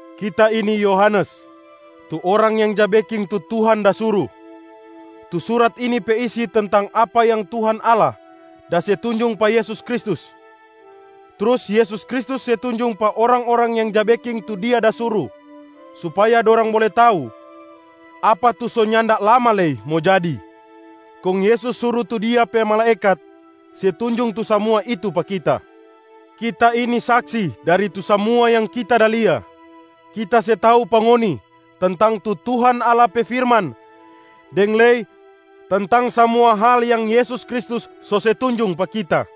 Kita ini Yohanes, tu orang yang ja beking tu Tuhan da suru. Tu surat ini pe isi tentang apa yang Tuhan Allah da se tunjung pa Yesus Kristus, trus Yesus Kristus se tunjung pa orang-orang yang ja beking tu Dia da suru supaya dorang bole tau apa tu so nyanda lama lei mo jadi. Kong Yesus suru tu Dia pe malaekat se tunjung tu samua itu pa kita. Kita ini saksi dari tu samua yang kita da lia: kita se tau pa ngoni tentang tu Tuhan Allah pe firman deng lei tentang samua hal yang Yesus Kristus so se tunjung pa kita.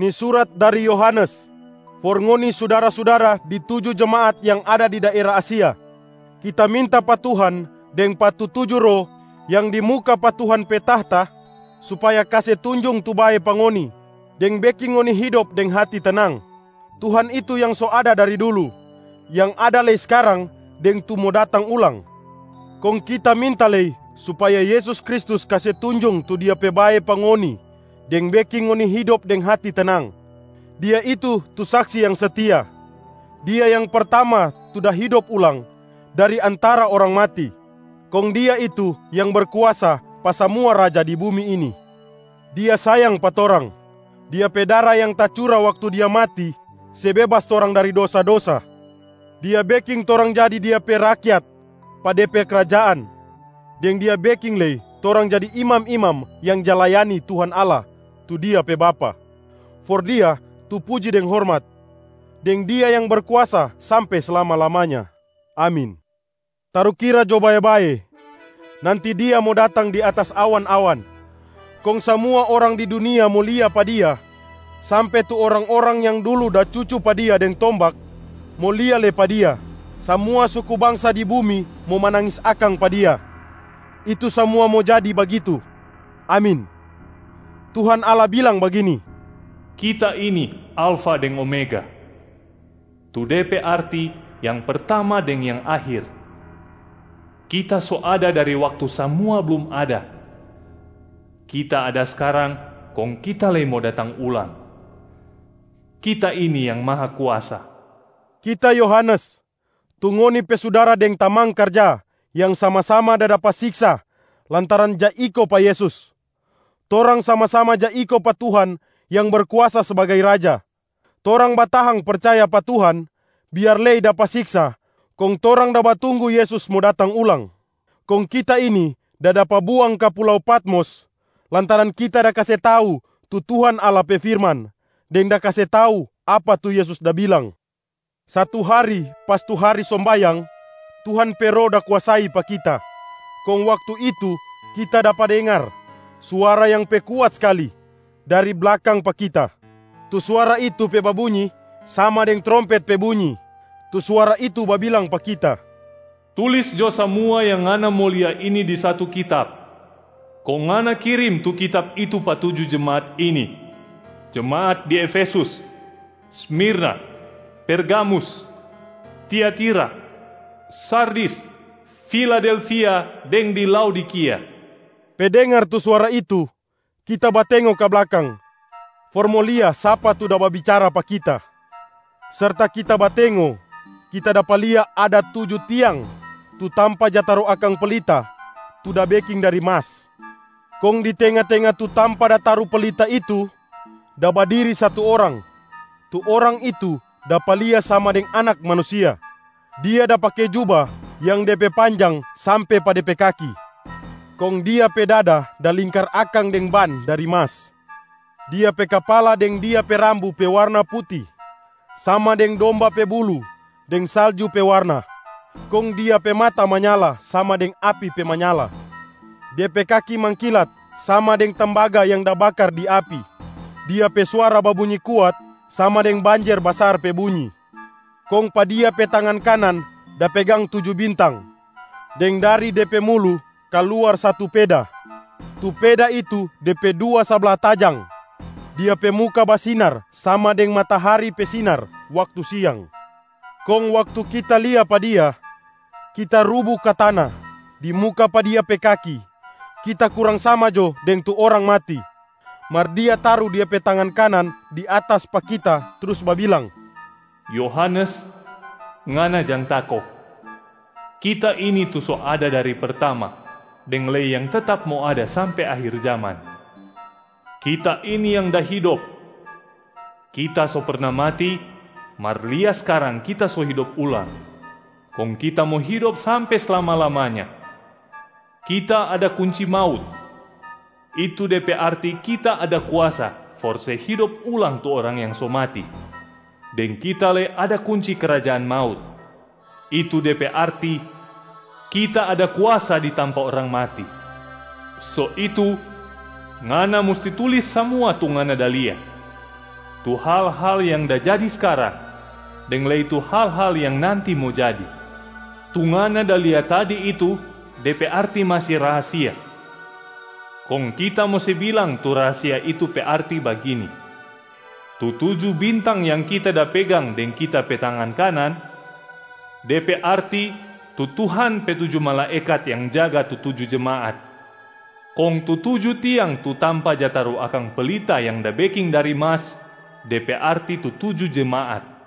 Ni surat dari Yohanes, for ngoni sudara-sudara di tuju jemaat yang ada di daera Asia. Kita minta pa Tuhan deng pa tu tuju roh yang di muka pa Tuhan pe tahta supaya kase tunjung tu bae pa ngoni deng beking ngoni hidop deng hati tenang. Tuhan itu yang so ada dari dulu, yang ada lei skarang deng tu mo datang ulang. Kong kita minta lei supaya Yesus Kristus kase tunjung tu Dia pe bae pa ngoni deng beking ngoni hidop deng hati tenang. Dia itu tu Saksi yang setia. Dia yang pertama tu da hidop ulang dari antara orang mati, kong Dia itu yang berkuasa pa samua raja di bumi ini. Dia sayang pa torang. Dia pe dara yang tacura waktu Dia mati se bebas torang dari dosa-dosa. Dia beking torang jadi Dia pe rakyat pa De pe krajaan, deng Dia beking lei torang jadi imam-imam yang ja layani Tuhan Allah tu Dia pe Bapa. For Dia tu puji deng hormat, deng Dia yang berkuasa sampe slama-lamanya. Amin. Tarukira jo bae-bae, nanti Dia mo datang di atas awan-awan, kong samua orang di dunia mo lia pa Dia sampe tu orang-orang yang dulu da cucu pa Dia deng tombak mo lia lei pa Dia. Samua suku bangsa di bumi mo manangis akang pa Dia. Itu samua mo jadi bagitu. Amin. Tuhan Allah bilang bagini, “Kita ini, Alfa deng Omega, tu de pe arti yang pertama deng yang akhir. Kita so ada dari waktu samua blum ada, Kita ada skarang kong Kita lei mo datang ulang. Kita ini Yang Mahakuasa.” Kita Yohanes, tu ngoni pe sudara deng tamang karja yang sama-sama da dapa siksa lantaran ja iko pa Yesus. Torang sama-sama ja iko pa Tuhan yang berkuasa sbagai raja, torang batahang percaya pa Tuhan biar lei dapa siksa kong torang da batunggu Yesus mo datang ulang. Kong kita ini da dapa buang ka pulau Patmos lantaran kita da kase tau tu Tuhan Allah pe firman deng da kase tau apa tu Yesus da bilang. Satu hari pas tu hari sombayang, Tuhan pe Roh da kuasai pa kita. Kong waktu itu kita dapa dengar suara yang pe kuat skali dari blakang pa kita. Tu suara itu pe babunyi sama deng trompet pe bunyi. Tu suara itu babilang pa kita, “Tulis jo samua yang ngana mo lia ini di satu kitab, kong ngana kirim tu kitab itu pa tuju jemaat ini: jemaat di Efesus, Smirna, Pergamus, Tiatira, Sardis, Filadelfia deng di Laodikia.” Pe dengar tu suara itu, kita batengo ka blakang for mo lia sapa tu da babicara pa kita. Serta kita batengo, kita dapa lia ada tuju tiang tu tampa ja taru akang pelita tu da beking dari mas. Kong di tenga-tenga tu tampa taru pelita itu da badiri satu orang. Tu orang itu dapa lia sama deng Anak Manusia. Dia da pake juba yang de pe panjang sampe pa de pe kaki, kong Dia pe dada da lingkar akang deng ban dari mas. Dia pe kapala deng Dia pe rambu pe warna puti sama deng domba pe bulu deng salju pe warna. Kong Dia pe mata manyala sama deng api pe manyala. Dia pe kaki mangkilat sama deng tembaga yang da bakar di api. Dia pe suara babunyi kuat sama deng banjer basar pe bunyi. Kong pa Dia pe tangan kanan da pegang tuju bintang, deng dari De pe mulu kaluar satu peda. Tu peda itu de pe dua sabla tajang. Dia pe muka basinar sama deng matahari pe sinar waktu siang. Kong waktu kita lia pa Dia, kita rubu ka tana di muka pa Dia pe kaki, kita kurang sama jo deng tu orang mati. Mar Dia taru Dia pe tangan kanan di atas pa kita trus babilang, “Yohanes, ngana jang tako! Kita ini tu so ada dari pertama deng lei yang tetap mo ada sampe akhir jaman. Kita ini yang da hidop! Kita so perna mati, mar lia skarang Kita so hidop ulang, kong Kita mo hidop sampe slama-lamanya. Kita ada kunci maut, itu de pe arti Kita ada kuasa for se hidop ulang tu orang yang so mati, deng Kita ada lei kunci krajaan maut, itu de pe arti Kita ada kuasa di tampa orang mati. So itu ngana musti tulis samua tu ngana da lia, tu hal-hal yang da jadi skarang deng lei tu hal-hal yang nanti mo jadi. Tu ngana da lia tadi itu de pe arti masi rahasia. Kong Kita mo se bilang tu rahasia itu pe arti bagini: tu tuju bintang yang Kita da pegang deng Kita pe tangan kanan, de pe arti tu Tuhan pe tuju malaekat yang jaga tu tuju jemaat. Kong tu tuju tiang tu tampa ja taru akang pelita yang da beking dari mas, de pe arti tu tuju jemaat.”